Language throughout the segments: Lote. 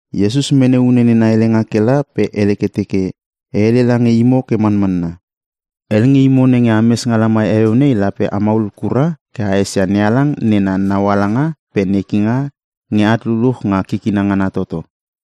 Iesus mene une nena helenga ke la pe hele ke teke, “E hele lange imo ke manmanna. Hel nge imo nenge ames nga lamai heueu nei, lape a maulul kura ke a esia NeHalang nena naualanga pe nekinga nge at luluch nga kikina ngana toto.”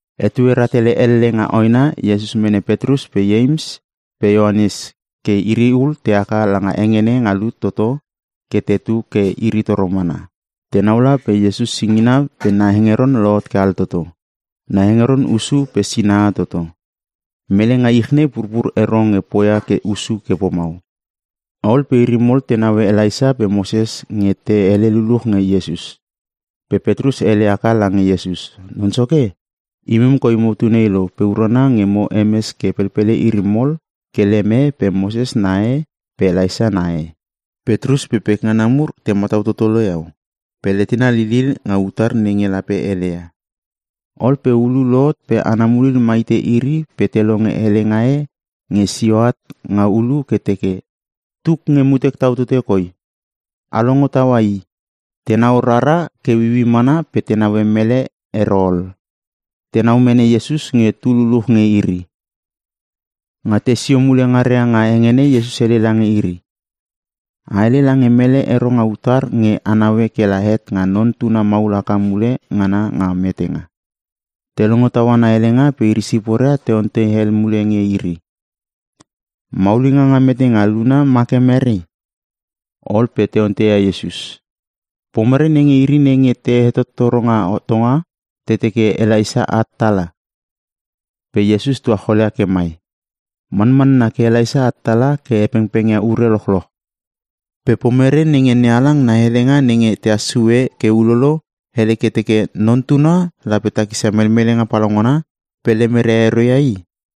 Etue rahtele elle nga hoena Iesus mene Petrus pe Ieims pe Ioanes ke iri ul te haka langa hengene nga lut toto ke tetu ke iri toro mana. Tenau la pe Iesus singina pe na hengeron lohot ke altoto. Na hengeron hussu pe sinaha toto. Mele nga ich nei purpur ero nge poia ke hussu ke pomau. Ol pe iri mol te naue Elaisa pe Moses nge te hele lululuch nge Iesus. Pe Petrus hele haka lange Iesus, “Non Soke, imem koi motu nei lo pe urana nge mo hemes ke pelpele iri mol ke lem e pe Moses na e pe Elaisa na e.” Petrus pe pekngana mur te matau toto lo iau pe letena lilil nga utar nenge lape heleia. Ol pe ulu lohot pe ana mulil ma hite iri pe te longe helenga e nge sio at nga ulu ke teke, “Tuk nge mutek tau tote koi. A longo taua i!” Tenau rara ke ueiuei mana pe te neue mele ero ol. Tenau mene Iesus nge tu luluch nge iri. Nga tesio mule ngaria nga hengene Iesus hele lange iri, “A hele lange mele ero nga utar nge a naue kela het nga Non Tuna maul haka mule ngana nga metenga.” Te longo taua na helenga pe iri siporia te ontei hel mule nge iri, “Maulinga nga metenga luna ma ke mere?” Ol pe te onteia Iesus, “Pomere nenge iri nenge te hetottoro nga hotonga te teke Elaisa at tala?” Pe Iesus tuacholia ke mai, “Manmanna ke Elaisa at tala ke he pengpengia ure lochloch. Pe pomere nenge NeHalang na helenga nenge tehas sue ke ulolo, hele ke teke Non Tuna lape takisia melmelenga palaungana pe lemeria ero ia i?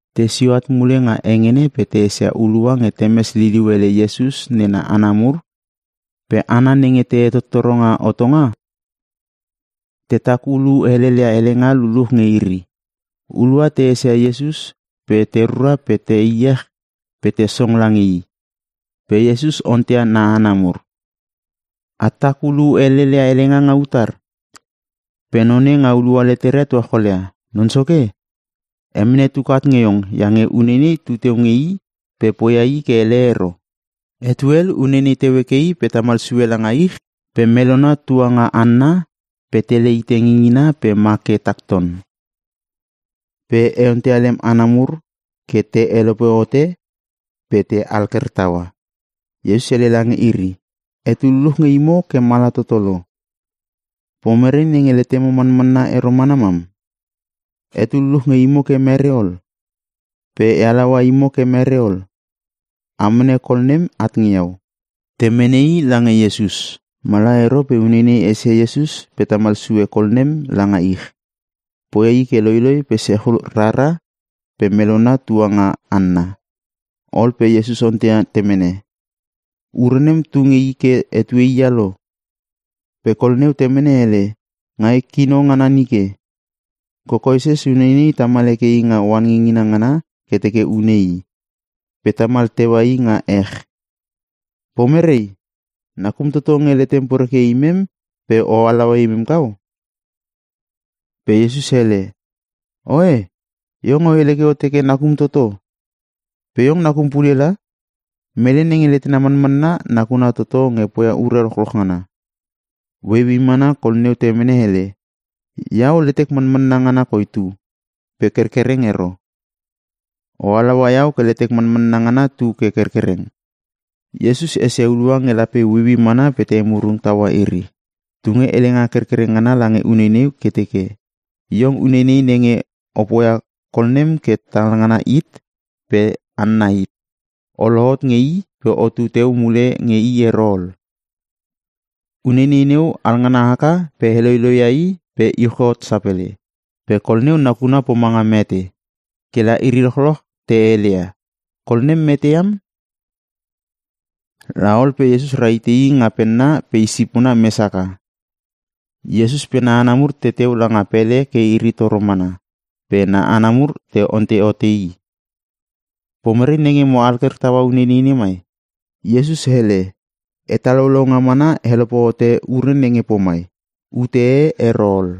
Tesio at mule nga hengene pe te esia hulua nge temes liliu ele Iesus nena hana mur pe hana nenge te hetottoro nga hotonga, tetak ulu helelia helenga luluch nge iri. Hulua te esia Iesus pe te rura pe te iech pe te song lange i. Pe Iesus onteia na hana mur, “A tak ulu heleleia helenga nga utar?” Pe None nga hulua leteria tuacholia, “Non Soke, e mene tuk at nge iong iange uneinei tuteu nge i pe poia i ke hele ero. Etue hel uneinei teu heke i pe tamal sue langa ich pe melona tua nga hanna, pe tele hite ngingina pe ma ke tak ton. Pe e onteia lem hana mur ke te helope hote pe te alker taua.” Iesus hele lange iri, “Etu luluch nge imo ke mala toto lo. Pomere nenge letemo manmanna ero mana mam? Etu luluch nge imo ke mere ol? Pe e halaua imo ke mere ol? A mene kol nem at nge iau!” Te mene i lange Iesus. Mala ero pe uneinei esia Iesus pe tamal sue kol nem langa ich. Poia i ke loiloi pe sechul rara pe melona tua nga hanna. Ol pe Iesus onteia temene, “Ure nem tu nge i ke etue hia lo?” Pe kol neu temene hele, “Nga i kino ngana nike. Kokoeses uneinei tamal heke i nga oan ngingina ngana ke teke une i. Pe tamal teua i nga ech. Pomere, nakum toto nge letem poreke ia imem pe o halaua imem kau?” Pe Iesus hele, “Oe, iong o hele ke o teke, ‘Nakum toto?’ Pe iong nakum pule la! Mele nenge letena manmanna, nakuna toto nge poia ure lochloch ngana.” Ueiuei mana kol neu temene hele, “Iau letek manmanna ngana koi tu, pe kerkereng ero. O halaua iau ke letek manmanna ngana tu ke kerkereng!” Iesus esia hulua nge lape ueiuei mana pe te emurung taua iri, tunge helenga kerkereng ngana langa uneinei ke teke, “Iong uneinei nenge o poia kol nem ke talngana hit pe hanna hit, o lohot nge i pe otu teu mule nge i ero ol!” Uneinei neu alngana haka pe heloiloi ia i pe iuch hot sapele. Pe kol neu nakuna pomanga mete. Kela iri lochloch te heleia, “Kol nem mete iam!” La ol pe Iesus rahite i nga penna pe isipona mes haka. Iesus pe na hana mur teteu langa pele ke iri toro mana, pe na hana mur te ontei hote i, “Pomere nenge mo alker taua uneinei nemai?” Iesus hele, “Hetalaulaunga mana helope hote ure nenge pomai. Ute e ero ol.”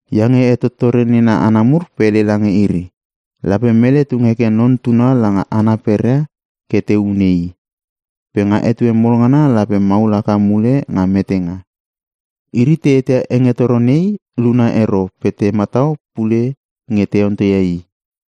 iange hetottore nena hana mur pe hele lange iri, “Lape mele tung heke Non Tuna langa hana peria ke te hune i. Pe nga etue mol ngana lape maul haka mule nga metenga.” Iri te eteia hengetoro nei luna ero pe te matau pule nge te onteia i.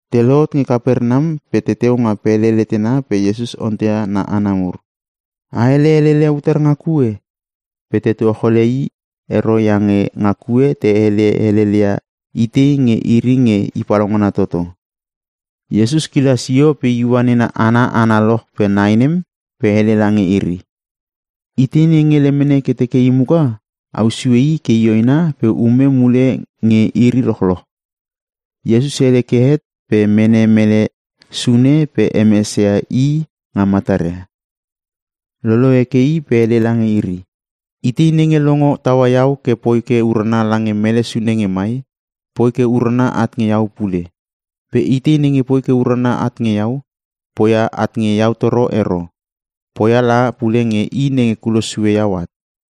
Te lohot nge Kapernam pe teteu nga pele letena pe Iesus onteia na hana mur, “A hele helel ia utar nga kue?” Pe te tuacholia i ero iange nga kue te hele helel ia itei nge iri nge i palaungana toto. Iesus kila sio pe iua nena hana analoch pe nai nem pe hele lange iri, “Itei nenge lemene ke teke i muka, au sue i ke i hoena pe ume mule nge iri lochloch.” Iesus hele ke het pe mene mele sune pe hemesia i nga mataria. Lolo heke i pe hele lange iri, “Itei nenge longo taua iau ke poi ke urana lange mele sune nge mai, poi ke urana at nge iau pule. Pe itei nenge poi ke urana at nge iau, poia at nge iau toro ero. Poia la pule nge i nenge kulos sue iau at.”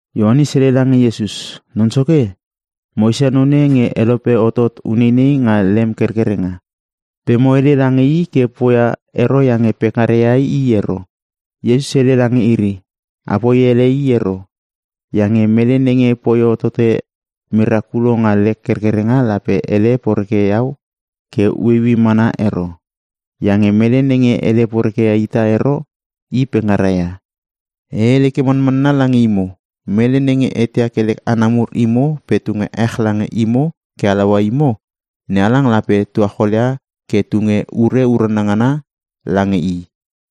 Ioanes hele lange Iesus, “Non soke, mo esia none nge helope hotot uneinei nga lem kerkerenga, pe mo hele lange i ke poia ero iange pekngara ia i ero.” Iesus hele lange iri, “Apoi ele i ero, iange mele nenge poi hotote merakulo nga lek kerkerenga lape hele poreke iau ke ueiuei mana ero. Iange mele nenge hele poreke ita ero, i pekngara ia. E hele ke manmanna lange imo, mele nenge eteia ke lek hana mur imo pe tunge ech lange imo ke halaua imo, NeHalang lape tuacholia ke tunge ure urana ngana lange i.”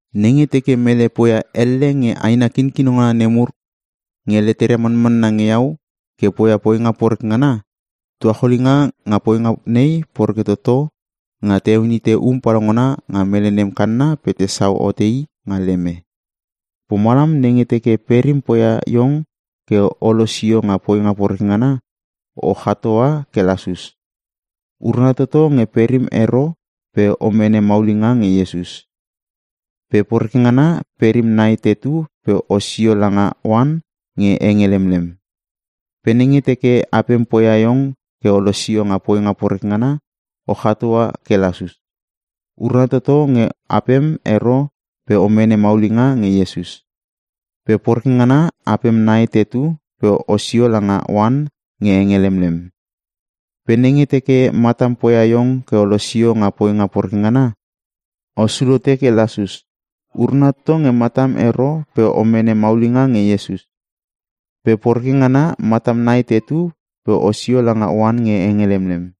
“Nenge teke mele poia elle nge aina kinkino ngana nemur nenge leteria manmanna nge iau ke poia poinga poreke ngana, tuacholinga nga poinga nei poreke toto nga te heon hite um palaungana nga mele nem kanna pe tesau hote i nga leme. Pomalam, nenge teke perim poia iong ke o losio nga poinga poreke ngana, o chatoa ke lasus! Urana toto nge perim ero pe o mene maulinga nge Iesus. Pe poreke ngana, perim nai tetu pe osio langa oan nge henge lemlem. Pe nenge teke apem poia iong ke o losio nga poinga poreke ngana, o chatoa ke lasus! Urana toto nge apem ero pe o mene maulinga nge Iesus. Pe poreke ngana, apem nai tetu pe osio lange oan nge henge lemlem. Pe nenge teke matam poia iong ke o losio nga poinga poreke ngana, osul hote ke lasus! Urana toto nge matam ero pe o mene maulinga nge Iesus. Pe poreke ngana, matam nai tetu pe osio langa oan nge henge lemlem.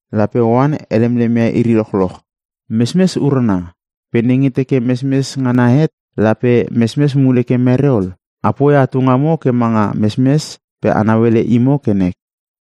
“Lape oan helemlem ia iri lochloch. “Mesmes urana. Pe nenge teke mesmes ngana het, lape mesmes mule ke mere ol? A poia atu ngamo ke manga mesmes pe a nauele imo ke nek.”